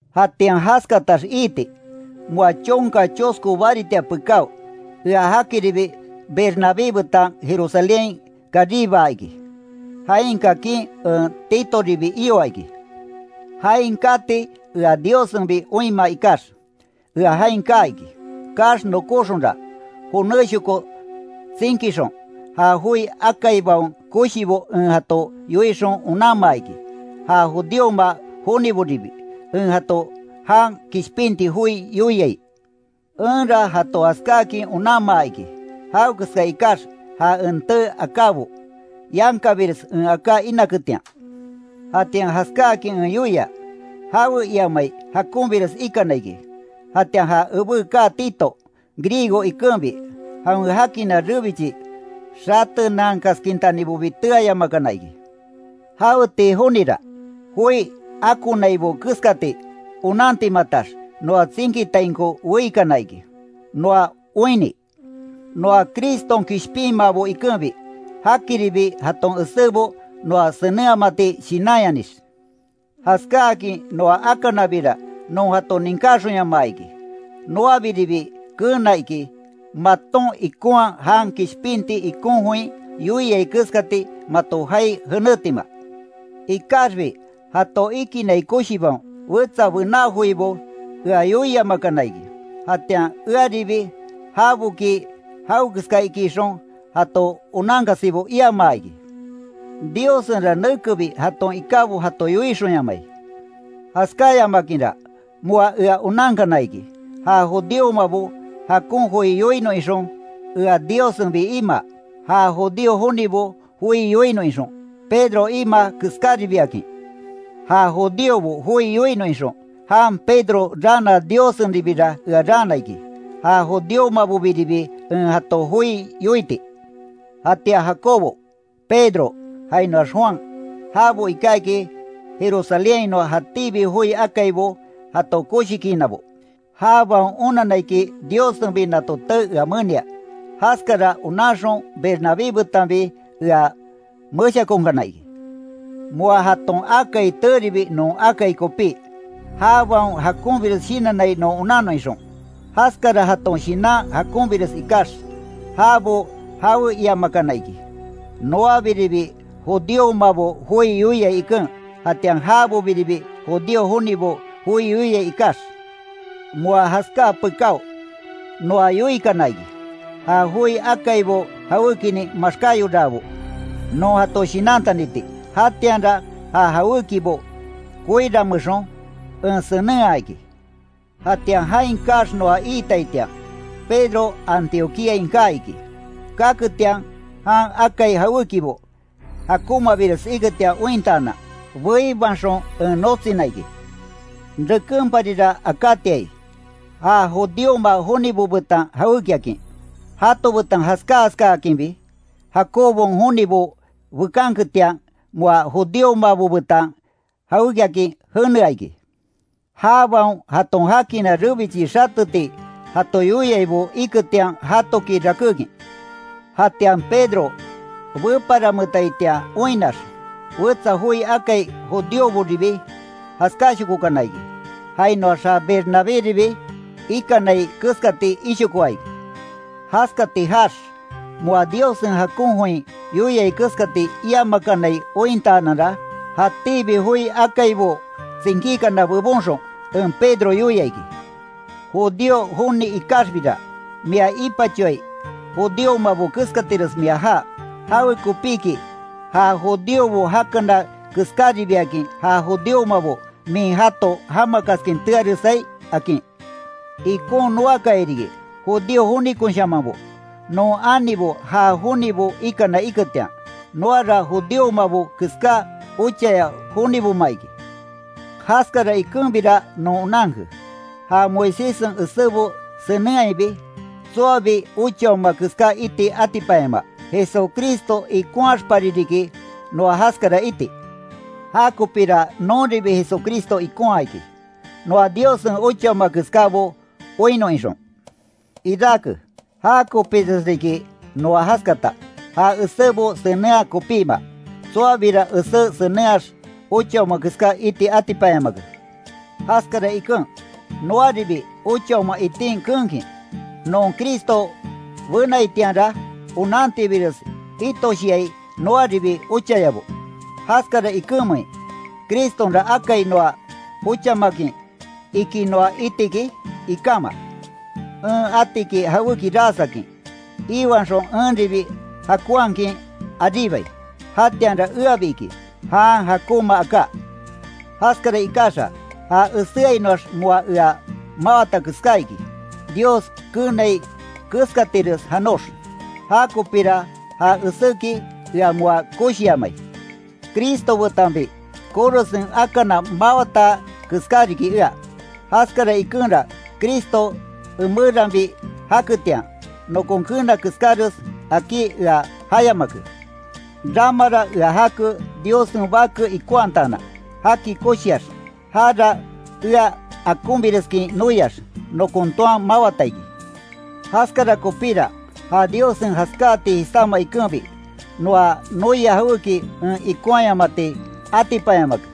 Jatian jaskatax iiti, moa chonka chosko baritia pekáo, ea jakiribi Bernabé betan Jerusalénhain karibaa iki. Jain kakin en Titoribi ioa iki. Jain kati ea Diossenbi oinmaa ikax, ea jain kaa iki. Kaax nokóxonra, jonéshoko tsinkixon, ja joi akaibaon koshibo en jato yoixon onanmaa iki, ja judíoma joniboribi, en jato jan kishpinti joi yoiai. Enra jato jaskáakin onanmaa iki, jawekeska ikax ja en tee akábo, yankabires en aká inaketian. Jatian jaskáakin en yoia, jawe iamai jakonbires ikana iki. Jatian ja ebé kaa Tito Griego ikenbi, jawen jakina rebichi xatenankaskintanibobi teayamakana iki. Jaweti jonira, joi akonaibo keskati onantimatax, noa tsinkitainko weikana iki, noa oinni; noa Criston kishpinmaabo ikenbi, jakiribi jaton esébo noa senenhamati shinanyanix. Jaskáakin noa akanabira, non jato ninkáxonyamaa iki. Noabiribi keena iki, maton ikonhaa jan kishpinti ikon join yoiai keskati mato jaai jenétima. Ikaxbi jato ikinai koshibaon, wetsa bená joibo ea yoiamakana iki. Jatian earibi, jaboki jawekeska iki ixon, jato onankasibo iamaa iki. Diossenra nekebi jaton ikábo jato yoixonyamai. Jaskáyamakinra, moa ea onankana iki, ja judíomabo jakon joi yoinon ixon, ea Diossenbi imaa. Ja judío jonibo joi yoinon ixon, Pedro imaa keskáribiakin. Ja judíobo joi yoinon ixon, jan Pedro raana Diossenribira ea raana iki, ja judíomabobiribi en jato joi yoiti. Jatian Jacobo, Pedro, jainoax Juan, jabo iká iki Jerusalénhainoa jatíbi joi akaibo jato koshikiinabo. Jabaon onanna iki, Diossenbi nato tee ea menia. Jaskara onanxon, Bernabé betanbi ea meshakonkana iki. Moa jaton akai teeribi non akai kopí, jabaon jakonbires shinannai non onannon ixon. Jaskara jaton shinan jakonbires ikax, jabo jawe iamakana iki; noabiribi judíomabo joi yoiai iken, jatian jabobiribi judío jonibo joi yoiai ikax. Moa jaskáa pekáo, noa yoikana iki, ja joi akaibo jawékinin maxkáyoraabo non jato shinantaniti. Jatianra ja jawékibo koiranmeexon en senenhaa iki. Jatian jain kaax noa iitaitian, Pedro Antioquíain kaa iki. Kaketian, jan akai jawékibo jakonmabires iketian ointaanan, beibaxon en notsina iki. Rekenparira akátiai, ja judíoma jonibo betan jawékiakin, jato betan jaská jaskakinbi, Jacobon jonibo bekanketian moa judíomabo betan jawékiakin jenea iki. Jabaon jaton jakina rebichi xateti jato yoiaibo iketian jatoki rakékin. Jatian Pedro, beparanmetaitian oinnax, wetsa joi akai judíoboribi jaskáshokokana iki, jainoax ja Bernabéribi ikanai keskati ishokoa iki. Jaskati jaax, moa Diossen jakon join yoiai keskati iamakanai ointaananra, jatíbi joi akaibo tsinkíkana bebonxon, en Pedro yoia iki: “Judío joni ikaxbira, mia ipachoai judíomabo keskatires mia jaa, ¿Jawekopíki, ja judíobo jakana keskáribiakin ja judíomabo min jato jamakaskin tearesai?” akin. Ikon noakaya riki, judío jonikonshamanbo, non anibo ja jonibo ikana iketian, noara judíomabo keská ochaya joniboma iki. Jaskara ikenbira non onanke, ja Moiséssen esébo senenhaibi, tsoabi ochaoma keská iti atipanyamaa. Jesucristo ikonhaxpari riki, noa jaskara iti. Ja kopira nonribi Jesucristo ikonhaa iki, noa Diossen ochaoma keskábo oinnon ixon. Irake, jakopires riki noa jaskata, ja esébo senenhaa kopíma. Tsoabira esé senenhaax, ochaoma keská iti atipanyamake. Jaskara iken, noaribi ochaoma itin keenkin, non Cristo benaitianra onantibires itoshiai noaribi ochayabo. ¿Jaskara ikenmein, Cristonra akai noa ochamakin, iki noa iti iki? Ikama. En ati iki jawéki ras akin, iiwanxon enribi jakonhakin aríbai, jatianra eabi iki, jan jakonmaaka. Jaskara ikaxa, ja eséainoax moa ea mawata keská iki, Dios keenai keskatires janox. Ja kopira ja eséki ea moa koshiamai. Cristo betanbi korosen akana mawata keská riki ea. Jaskara ikenra Cristo emeranbi jaketian, nokon keena keskáres akí ea jayamake. Rama ea jake, Diossen Bake ikonhataanan, jaki koshiax, jara ea akonbireskin noiax, nokon toan mawata iki. Jaskara kopíra, ja Diossen jaskáati jisáma ikenbi, noa noia jawéki en ikonhayamati atipanyamake.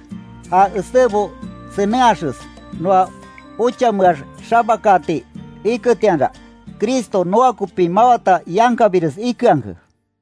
Ja esébo senenhaxes noa ochameax xabakaati iketianra, Cristo noa kopi mawata yankabires ikeanke.